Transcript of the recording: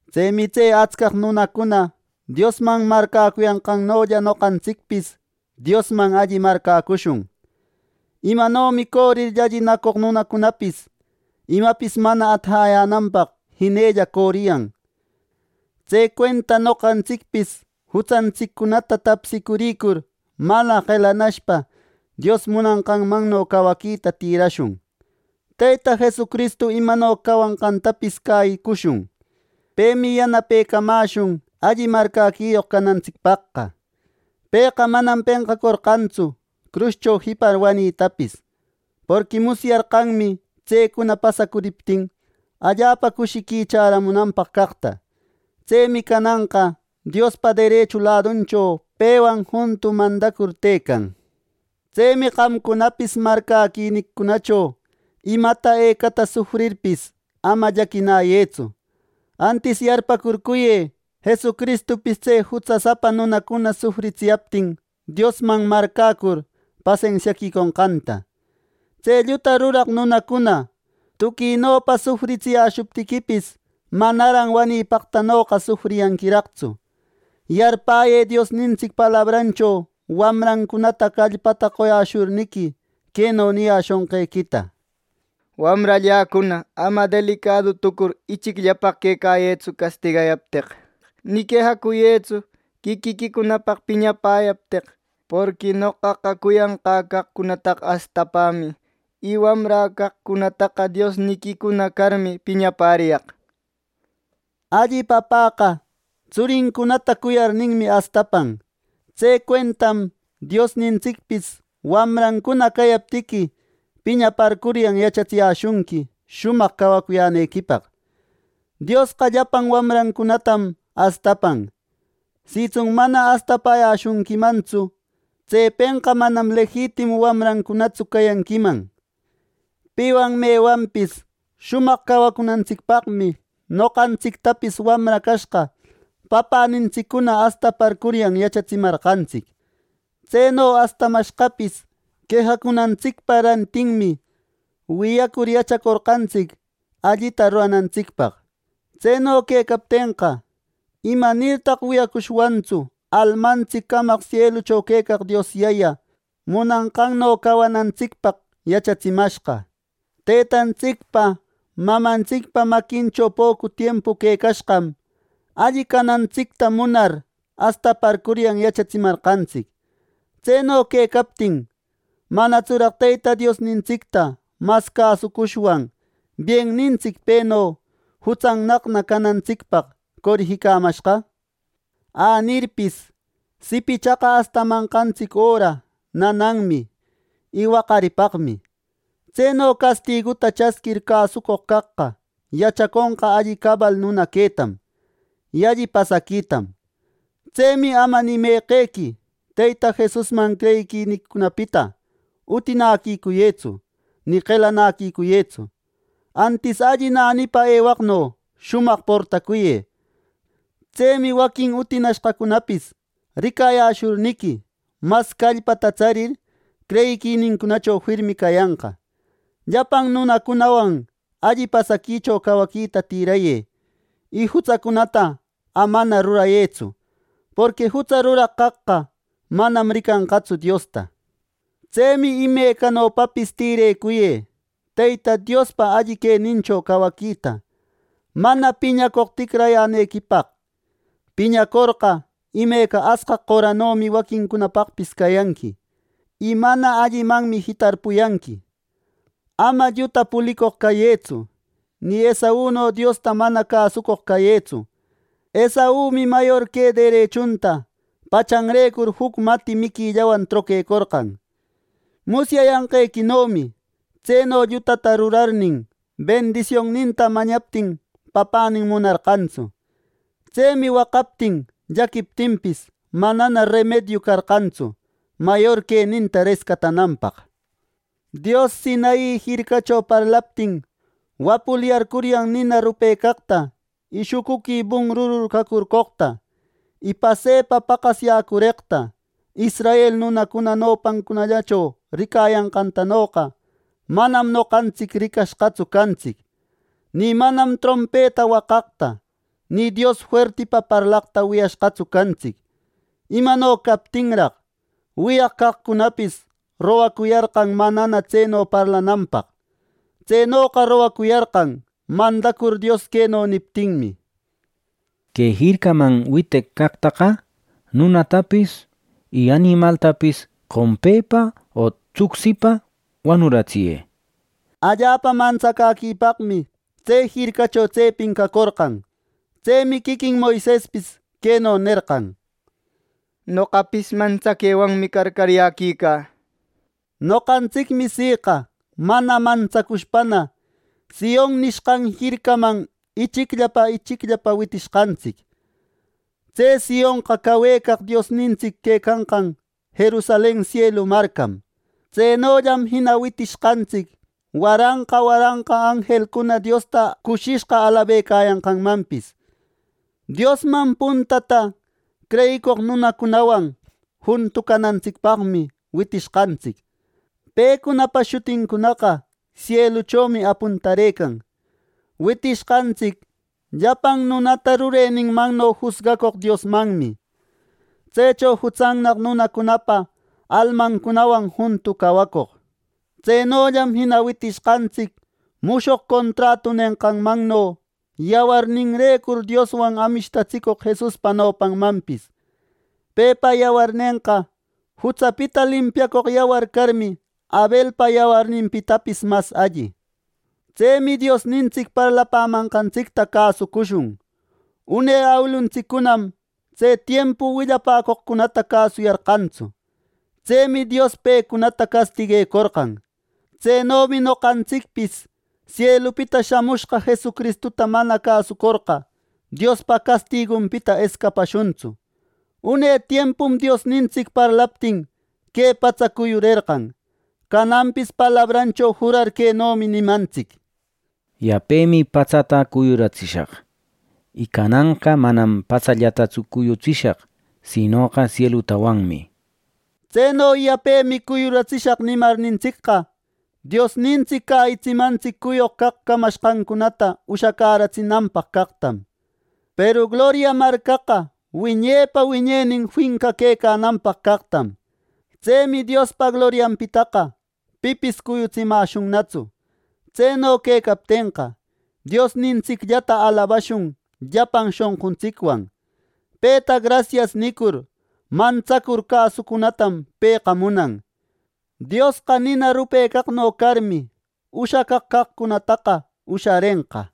Tsemi tse atsca nunacuna Diosman marcäcuyanqannolla noqantsicpis Diosman alli marcäcushun. Imanomi corir llallinacoq nunacunapis imapis mana atajäyänanpaq jinella coriyan; tse cuenta noqantsicpis jutsantsiccunata tapsicuricur, mana qelanashpa Dios munanqanno cawaquita tïrashun. Teyta Jesucristu imano cawanqantapis cäyicushun. Pemi yanapecamäshun alli marcäquiyoq canantsicpaqqa. Pëqa manam penqacorqantsu cruscho jipar wanitapis. Porqui musyarqanmi tsecuna pasacuriptin, allapa cushiqui chäramunanpaq caqta. Tsemi cananqa Diospa derechu laduncho pewan juntu mandacur tëcan. Tsemi qamcunapis marcäquiniquicunacho imata ecata sufrirpis, ama llaquinäyëtsu; antis yarpäcurcuyë Jesucristupis tse jutsasapa nunacuna sufritsiyaptin Diosman marcäcur pasensiaquiconqanta. Tse lluta ruraq nunacuna tuquinopa sufritsiyäshuptiquipis, manaran wanipaqtanoqa sufriyanquiraqtsu. Yarpäyë Diosnintsic palabrancho wamrancunata callpata qoyäshurniqui, queno niyäshonqequita: “Wamralläcuna, ama delicadu tucur ichicllapaq quecayëtsu castigayapteq, ni quejacuyëtsu quiquiquicunapaq piñapäyapteq. Porqui noqaqa cuyanqä caqcunataqa astapämi, y wamrä caqcunataqa Diosniquicuna carmi piñapäriyaq” nenqanta. Alli papäqa tsurincunata cuyarninmi astapan. Tse cuentam Diosnintsicpis wamrancuna cayaptiqui, piñaparcuryan yachatsiyäshunqui shumaq cawacuyänequipaq. Diosqa llapan wamrancunatam astapan, sitsun mana astapäyäshunquimantsu; tsepenqa manam lejitimu wamrancunatsu cayanquiman. Piwan mewanpis shumaq cawacunantsicpaqmi noqantsictapis wamra cashqa papänintsiccuna astaparcuryan yachatsimarqantsic. Tseno astamashqapis quejacunantsicpa rantinmi wiyacur yachacorqantsic allita ruranantsicpaq. Tseno quecaptenqa, ¿imanirtaq wiyacushwantsu almantsic camaq sielucho quecaq Dios Yaya munanqanno cawanantsicpaq yachatsitsimashqa! Tëtantsicpa, mamantsicpa maquincho pocu tiempu quecashqam, alli canantsicta munar astaparcuryan yachatsimarqantsic. Tseno quecaptin ¿manatsuraq Teyta Diosnintsicta mas cäsucushwan biennintsic peno jutsannaqna canantsicpaq corijimashqa! Anirpis, sipichaqa astamanqantsic öra nananmi y waqaripaqmi; tseno castiguta chasquir cäsucoq caqqa yachaconqa alli cabal nuna quetam, y alli pasaquitam. Tsemi ama ni meqequi Teyta Jesusman creyiquiniquicunapita utinaquicuyëtsu ni qelanäquicuyëtsu. Antis alli nänipa ewaqno shumaq portacuyë. Tsemi waquin utinashqacunapis ricayäshurniqui, mas callpata tsarir, creyiquinincunacho firmi cayanqa. Llapan nunacunawan alli pasaquicho cawaquita tirayë, y jutsacunata amana rurayëtsu; porqui jutsa ruraq caqqa manam ricanqatsu Diosta. Tsemi imecanopapis tïrecuyë Teyta Diospa alli quenincho cawaquita, mana piñacoq ticrayänequipaq. Piñacorqa, imeca asqaq qoranomi waquincunapaqpis cayanqui; y mana allimanmi jitarpuyanqui. Ama lluta pulicoq cayëtsu; ni Esauno Diosta mana cäsucoq cayëtsu. Esaumi mayor que derechunta pachanrecur juc mati miquillawan troquecorqan. Musyayanqequinomi tseno llutata rurarirnin, bendisionninta mañaptin papänin munarqantsu. Tsemi waqaptin llaquiptinpis, manana remediu carqantsu mayor queninta rescatananpaq. Dios Sinai jircacho parlaptin, wapulyarcuryan nina rupecaqta, y shucuqui bunrurur cacorqoqta, y pasepa paqasyäcureqta israel nunacuna nopancunallacho ricayanqantanoqa manam noqantsic ricashqatsu cantsic. Ni manam trompeta waqaqta, ni Dios fuerti parlaqta wiyashqatsu cantsic. Imano captinraq, wiyaq caqcunapis rogacuyarqan manana tseno parlananpaq. Tsenoqa rogacuyarqan mandacur Dios queno niptinmi: “Que jircaman witeq caqtaqa nunatapis, y animaltapis qompepa o tucsipa wanuratsiyë” nir. Allapa mantsacäquipaqmi tse jircacho tsepin cacorqan. Tsemi quiquin Moisespis queno nerqan: “Noqapis mantsaquewanmi carcaryäquica” nir. Noqantsicmi siqa mana mantsacushpana “Sion” nishqan jircaman ichicllapa, ichicllapa witishqantsic. Tse Sionqa cawecaq Diosnintsic quecanqan Jerusalen sielu marcam. Tsenollam jina witishqantsic waranqa waranqa anjelcuna Diosta cushishqa alabecayanqanmanpis. Diosman puntata creyicoq nunacunawan juntu canantsicpaqmi witishqantsic. Pecunapa shutincunaqa sieluchomi apuntarëcan. Witishqantsic llapan nunata rureninmanno jusgacoq Diosmanmi; tsecho jutsannaq nunacunapa almancunawan juntu cawacoq. Tsenollam jina witishqantsic mushoq contratu nenqanmanno yawarninrecur Dioswan amishtatsicoq Jesuspa nopanmanpis. Pepa yawarnenqa, jutsapita limpiacoq yawar carmi Abelpa yawarninpitapis mas alli. Tsemi Diosnintsic parlapämanqantsicta cäsucushun. Une awiluntsiccunam tse tiempu willapäcoqcunata cäsuyarqantsu. Tsemi Dios pecunata castiguecorqan. Tsenomi noqantsicpis sielupita shamushqa Jesucristuta mana cäsorqa, Diospa castigunpita escapashuntsu. Une tiempum Diosnintsic parlaptin que patsa cuyurerqan. Cananpis palabrancho jurar quenomi nimantsic: “Yapemi patsata cuyuratsishaq, y cananqa manam patsallatatsu cuyutsishaq, sinoqa sielutawanmi” nir. Tseno “Yapemi cuyuratsishaq” nimarnintsicqa, Diosnintsic cäyitsimantsic cuyoq caq camashqancunataqa ushacäratsinanpaq caqtam, peru gloria marcaqa wiñepa wiñenin finca quecananpaq caqtam. Tsemi Diospa glorianpitaqa pipis cuyutsimäshunnatsu. Tseno quecaptenqa, Diosnintsicllata alabashun llapan shonquntsicwan. Peta “Grasias” nicur mantsacur cäsucunatam pëqa munan. Diosqa nina rupecaqno carmi, ushacaq caqcunataqa usharenqa.